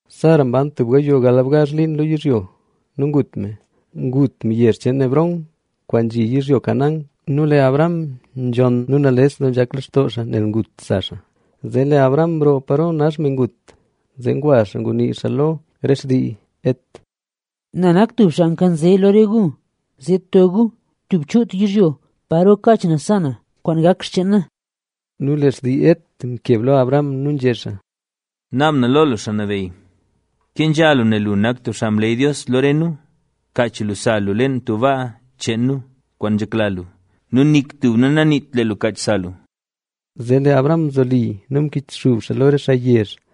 Sara mban tub gayoo galbgazh liin lo yizhyo nu ngut me. Ngut me yezh cheen Hebrón, kwaan nzhi yizhyo Canaán nu lee Abraham nzhonn nu nales doo nzhak lextoo nel ngut sa xaa. Zee lee Abraham mroo paro nax me ngut, zee ngwa xaa ngunii xaa lo re xtii Het. —Na nak tub xaa nkanze lo re gu; zee to gu tub chuut yizhyo paro kaach na sa na, kwaan gak xcheen na. Nu lee xtii Het mkeb lo Abraham nu nzhé xaa: —Naab na lo lu, xaa nabeyy, kenzha lu nel lu nak tub xaa mleey Dios lo re nu, kaach sa lu leen tub baa cheen nu, kwaan nzhekla lu nu nik tub nu naniit lee lu kaach sa lu. Zee lee Abraham mzoli nu mkichxub xaa lo re xaa yezh,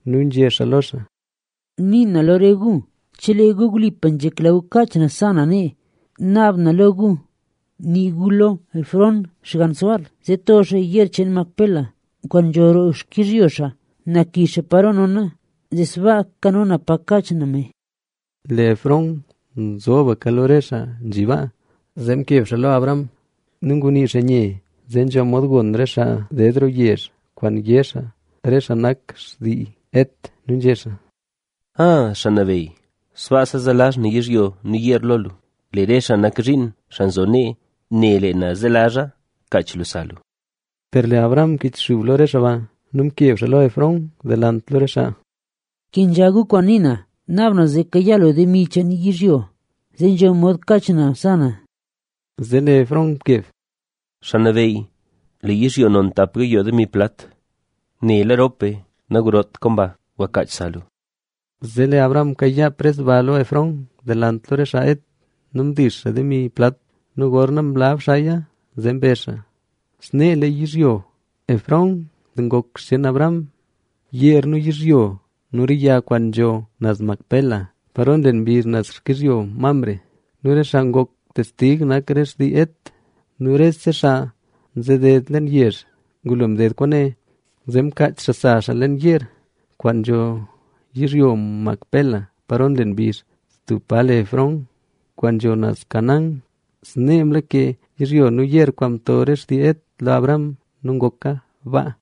nu nzhé xaa lo xaa: —Nii na lo re gu chelee gu wlipa nzhekla gu kaach na sa na nee, naab na lo gu, nii gu lo Efrón, xgann Zohar, zee to xaa yeer cheen Macpela, kwaan nzho roo xkizhyo xaa. Na kixa paro nona, zee sbaa kano na pa kaach na me. Lee Efrón mzobka lo re xaa nzhi baa. Zee mkeb xaa lo Abraham lo re xaa nu ngunii xaa nye, zee nzho mod gon re xaa ded roo yezh re kwaan yé re xaa nak xtii Het, nu nzhé xaa: —Aa, xaa nabeyy, sbaasa zelazh na yizhyo nu yeer lo lu, lee re xaa nak zhiin, xaa nzo nee ne lee na zelazha; kach lu sa lu. Per lee Abraham mkichxub lo re xaa baa nu mkeb xaa lo Efrón delant lo re xaa: —Kenzha gu kwaan nii na, naab na zee kayaa lu demi cheen yizhyo, zee nzho mod kaach na sa na. Zee lee Efrón mkeb: —Xaa nabeyy, lee yizhyo non tap gayoo demi plat. Nela rop be, nagrot kwaan ba. Gwa kaach sa lu. Zee lee Abraham mkayaa pres ba lo Efrón delant lo re xaa Het nu mdix xaa demi plat. Nu gorna mlab xaaya, zee mbezha. Snee lee yizhyo Efrón ngok xcheen Abraham, yeer nu yizhyo nu re yag kwaan nzho naz Macpela, paro nlen mbizh naz xkizhyo Mamre. Nu re xaa ngok testig nak re xtii Het nu rese xaa nzeded leen yezh. Ngulo mded kwaane, zee mkaach xaa sa xaa leen yeer, kwaan nzho yizhyo Macpela paro nlen mbizh, tub pa le Hebrón kwaan nzho naz Canaán. Snee mlake yizhyo nu yeer kwaan mto re xtii Het lo Abraham nu ngoka baa.